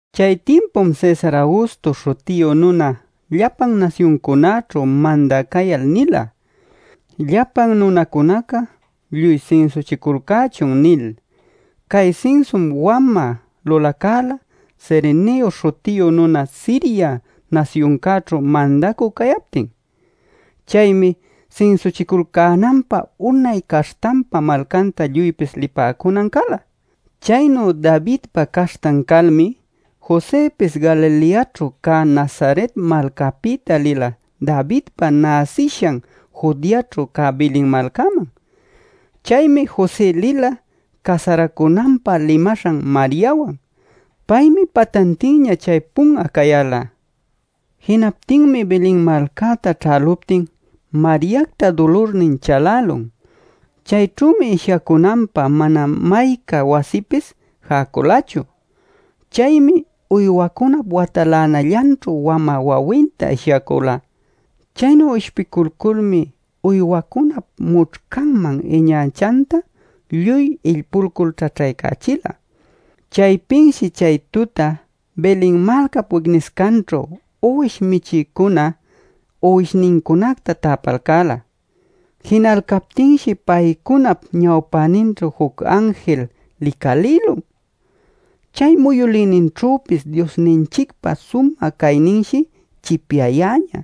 Chay timpum Cesar Augusto śhutiyu nuna llapan nasyuncunäćhu mandä cayal nila: “Llapan nunacunaca lluy sinsuchiculcächun” nil. ( Cay sinsum wamä lulacala, Cerenio śhutiyu nuna Siria nasyuncäćhu mandacü cayaptin.) Chaymi sinsuchiculcänanpä unay caśhtanpa malcanta lluypis lipäcunan cala. Chaynu Davidpa caśhtan calmi, Josëpis Galileaćhu cä Nazaret malcapïta lila Davidpa näsishan Judeaćhu cä Belen malcaman. Chaymi José lila casaracunanpä limaśhan Mariawan. Paymi patantinña chaypun'a cayäla. Jinaptinmi Belen malcäta ćhäluptin Mariacta dulurnin chalälun. Chayćhümi ishyacunanpä mana mayca wasipis jäculachu. Chaymi uywacunap watalänallanćhu wamä wawinta ishyacula. Chaynu ishpiculculmi uywacunap mućhcanman iñachanta lluy illpulcul ćhaćhaycachila. Chaypinshi chay tuta Belen malcap wicniscanćhu uwish michïcuna uwishnincunacta täpalcäla. Jinalcaptinshi paycunap ñawpäninćhu juc anjil licalïlun. Chay muyülïninćhüpis Diosninchicpa sumä cayninshi chipyayäñä.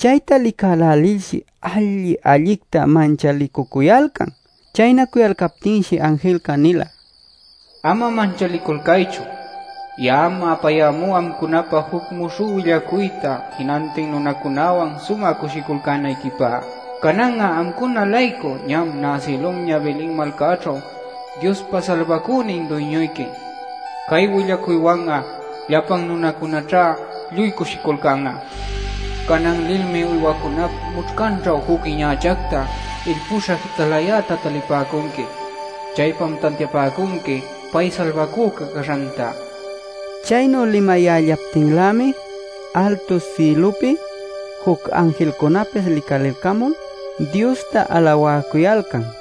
Chayta licälälilshi alli-allicta manchalicucuyalcan. Chaynacuyalcaptinshi anjilca nila: “Ama manchaliculcaychu. Ya'am apayämú amcunapä juc muśhü willacuyta jinantin nunacunäwan sumä cushiculcänayquipä. Canan'a amcuna-laycu ñam näsïlunña Belen malcäćhu Diospa Salbacünin Duyñuyqui. Cay willacuywan'a llapan nunacunäćha lluy cushiculcan'a. Canan lilmi uywacunap mućhcanćhu juc iñachacta, illpüśha jitalayäta talipäcunqui. Chaypam tantiapäcunqui pay Salbacüca caśhanta” nil. Chaynu limayällaptinlämi altu sïlupi juc anjilcunapis licalilcamul Diosta alawäcuyalcan: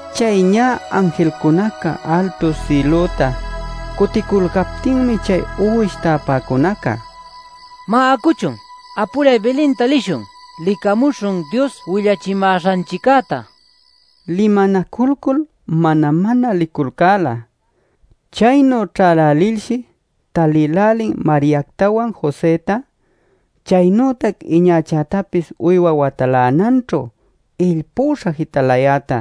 Chay ñä anjilcunaca altu sïlüta cuticulcaptinmi chay uwish täpäcunaca: “¡Má, acuchun, apuray Belenta lishun! ¡Licamuśhun Dios willachimäśhanchiccäta!” limanaculcul mana-mana liculcäla. Chaynu ćhälälilshi talïlälin Mariactawan, Josëta, chaynütac iñachätapis uywa watalänanćhu illpuśha jitalayäta.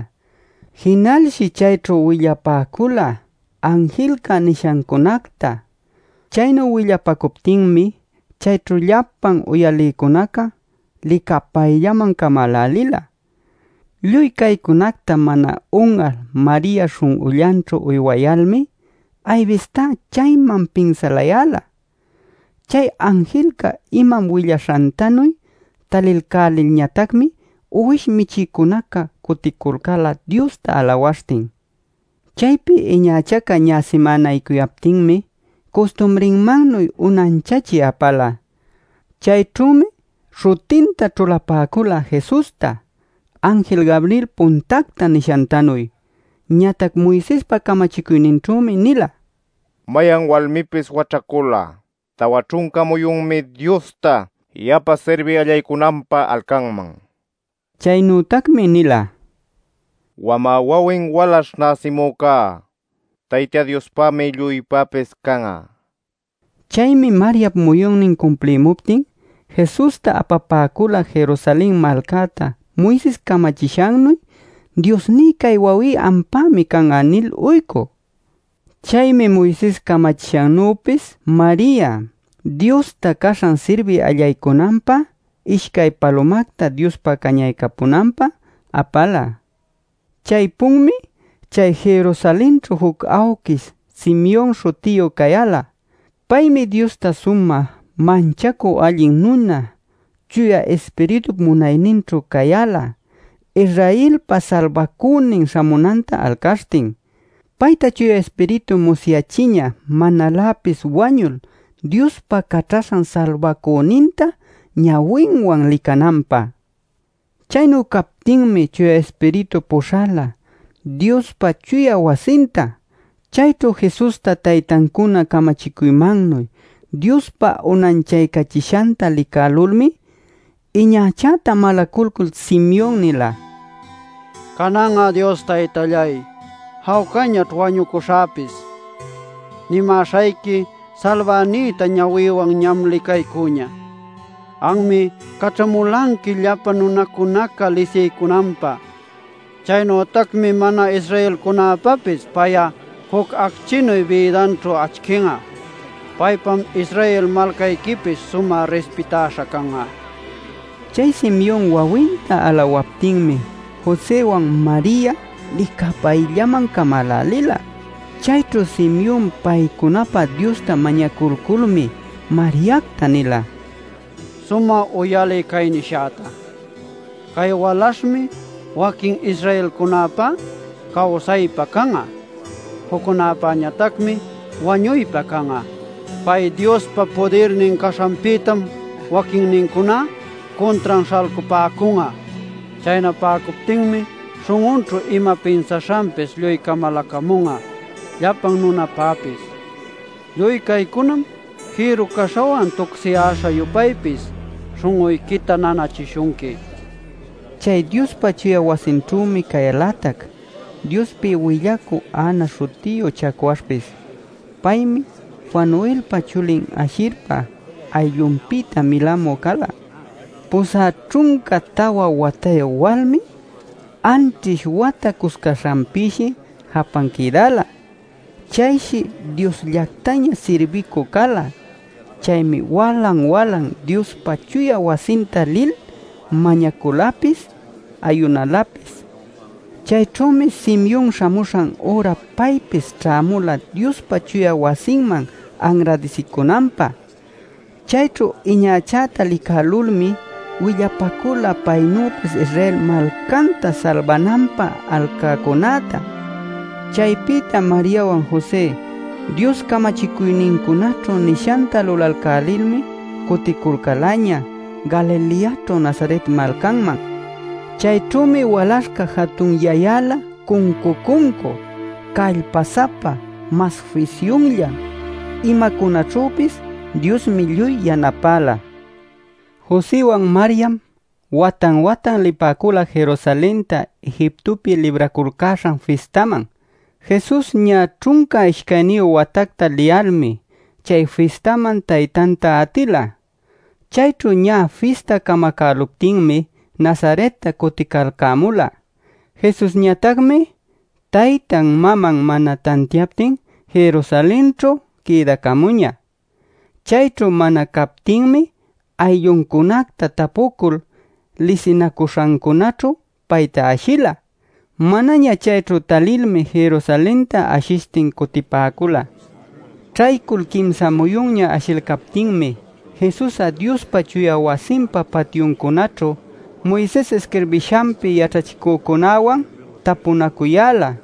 Jinalshi chayćhu willapacula anjilca nishancunacta. Chaynu willapacuptinmi chayćhu llapan uyalïcunaca licapayllaman camälälila. Lluy caycunacta mana un'al Maria śhun'ullanćhu uywayalmi aybistá chayman pinsalayäla. Chay anjilca imam willaśhantanuy talilcälilñatacmi uwish michïcunaca cuticulcäla Diosta alawaśhtin. Chaypi iñachaca ñä simänaycuyaptinmi custumrinmannuy unanchachï apala. Chayćhümi śhutinta ćhulapäcula “Jesusta” anjil Gabriel puntacta nishantanuy. Ñatac Moisespa camachicuyninćhümi nila: “Mayan walmipis waćhacul'a tawa ćhunca muyunmi Diosta yapa sirbï allaycunanpä alcanman” nil. Chaynütacmi nila: “Wamä wawin walaśh näsimücá Tayta Diospämi lluypäpis can'a” nil. Chaymi Mariap muyunnin cumplimuptin Jesusta apapäcula Jerusalen malcäta Moises camachishannuy “Diosní, cay wawí ampämi can'a” nil uycü. Chaymi Moises camachishannüpis Maria Diosta caśhan sirbï allaycunanpä ishcay palumacta Diospa cañaycapunanpä apala. Chaypunmi chay Jerusalenćhu juc awquish Simeon śhutiyu cayäla. Paymi Diosta sumä manchacü allin nuna Chuya Ispiritup munayninćhu cayäla Israelpa Salbacünin śhamunanta alcaśhtin. Payta Chuya Ispiritum musyachiñä manaläpis wañul Diospa Caćhaśhan Salbacüninta ñawinwan licananpä. Chaynu cayaptinmi Chuya Ispiritu puśhala Diospa chuya wasinta. Chayćhu Jesusta taytancuna camachicuymannuy Diospä unanchayächishanta licalculmi iñachäta malaculcul Simeon nila: “Canan'a, Dios Taytalláy, jawcañaćh wañucuśhäpis. Nimäśhayqui salbänïta ñawïwan ñam licaycüña. Anmi caćhamulanqui llapan nunacunaca lisiycunanpä. Chaynütacmi mana-Israelcunapäpis pay'á juc acchinu bïdanćhu acchin'a. Paypam Israel malcayquipis sumä rispitaśha can'a” nil. Chay Simeon wawinta alawaptinmi, Josëwan Maria licapayllaman camälälila. Chayćhu Simeon paycunapä Diosta mañaculculmi Mariacta nila: “Sumä uyaliy cay nishäta. Cay walaśhmi waquin Israelcunapá cawsaypä can'a, juccunapañatacmi wañuypä can'a. Pay Diospa pudirnin caśhanpïtam waquinnincuná cuntran śhalcapäcun'a. Chaynapäcuptinmi śhun'unćhu ima pinsaśhanpis lluy camaläcamun'a llapan nunapapis. Lluy caycunam jïru-caśhawan tucsiyäśha-yupaypis śhun'uyquita nanachishunqui” nil. Chay Diospa chuya wasinćhümi cayälatac Diospi willacü Ana śhutiyu chacwaśhpis. Paymi Fanuelpa chulin Ashirpa ayllunpïta milamü cala. Pusä ćhunca tawa watayu walmi anćhish wata cuscaśhanpïshi japan quïdäla. Chayshi Diosllactaña sirbïcü cala. Chaymi walan-walan Diospa chuya wasinta lil mañaculapis ayunalapis. Chayćhümi Simeon śhamuśhan üra paypis ćhämula Diospa chuya wasinman anradisicunanpä. Chayćhu iñachäta licälulmi willapacula paynüpis Israel malcanta salbananpä alcäcunäta. Chaypïta Mariawan José, Dios camachicuynincunaćhu nishanta lulalcälilmi cuticulcälaña Galileaćhu Nazaret malcanman. Chayćhümi walaśhca jatunyayäla cuncu-cuncu, callpa-sapa mas fisyunllan. Imacunaćhüpis Diosmi lluy yanapäla. Josëwan Mariam watan-watan lipäcula Jerusalenta Egiptopi Libraculcäśhan fistanman. Jesus ñä ćhunca ishcayniyu watacta liyalmi, chay fistaman taytanta atila. Chayćhu ñä fista camacäluptinmi Nazaretta cuticalcämula. Jesusñatacmi taytan maman mana tantiaptin Jerusalenćhu quïdacamuñä. Chayćhu mana captinmi aylluncunacta tapucul, lisinacuśhancunaćhu payta ashila. Manaña chayćhu talilmi Jerusalenta ashishtin cutipäcula. Ćhaycul quimsa muyunña ashilcaptinmi Jesus'a Diospa chuya wasinpa patyuncunaćhu, Moises isquirbishanpi yaćhachicücunawan tapunacuyäla.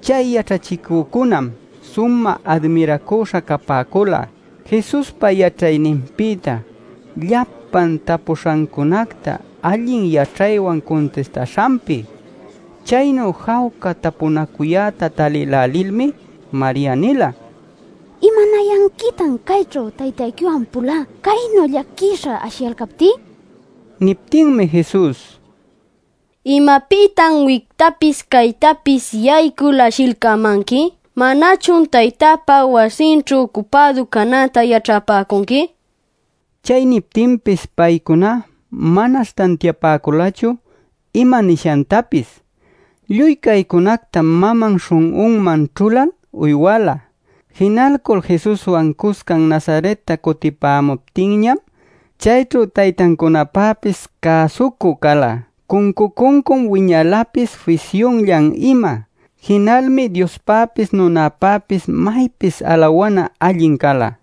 Chay yaćhachicücunam sumä admiracüśha capäcula Jesuspa yaćhayninpïta llapan tapuśhancunacta allin yaćhaywan cuntistaśhanpi. Chaynu jawca tapunacuyäta talïlälilmi Maria nila: “¿Imanayanquitan cayćhu taytayquiwan pulá caynu llaquisha ashiyalcaptí?” nil. Niptinmi Jesus: “¿Imapïtan wictapis caytapis yaycul ashilcämanqui? ¿Manachun Taytäpa wasinćhu ucupädu canäta yaćhapäcunqui?” nila. Chay niptinpis paycuná manash tantiapäculachu ima nishantapis. Lluy caycunactam maman śhun'unman ćhulal uywala. Jinalcul Jesuswan cuscan Nazaretta cutipämuptinñam chayćhu taytancunapäpis cäsucü cala. Cuncu-cuncum wiñalapis fisyunllan ima. Jinalmi Diospäpis nunapäpis maypis alawana allin cala.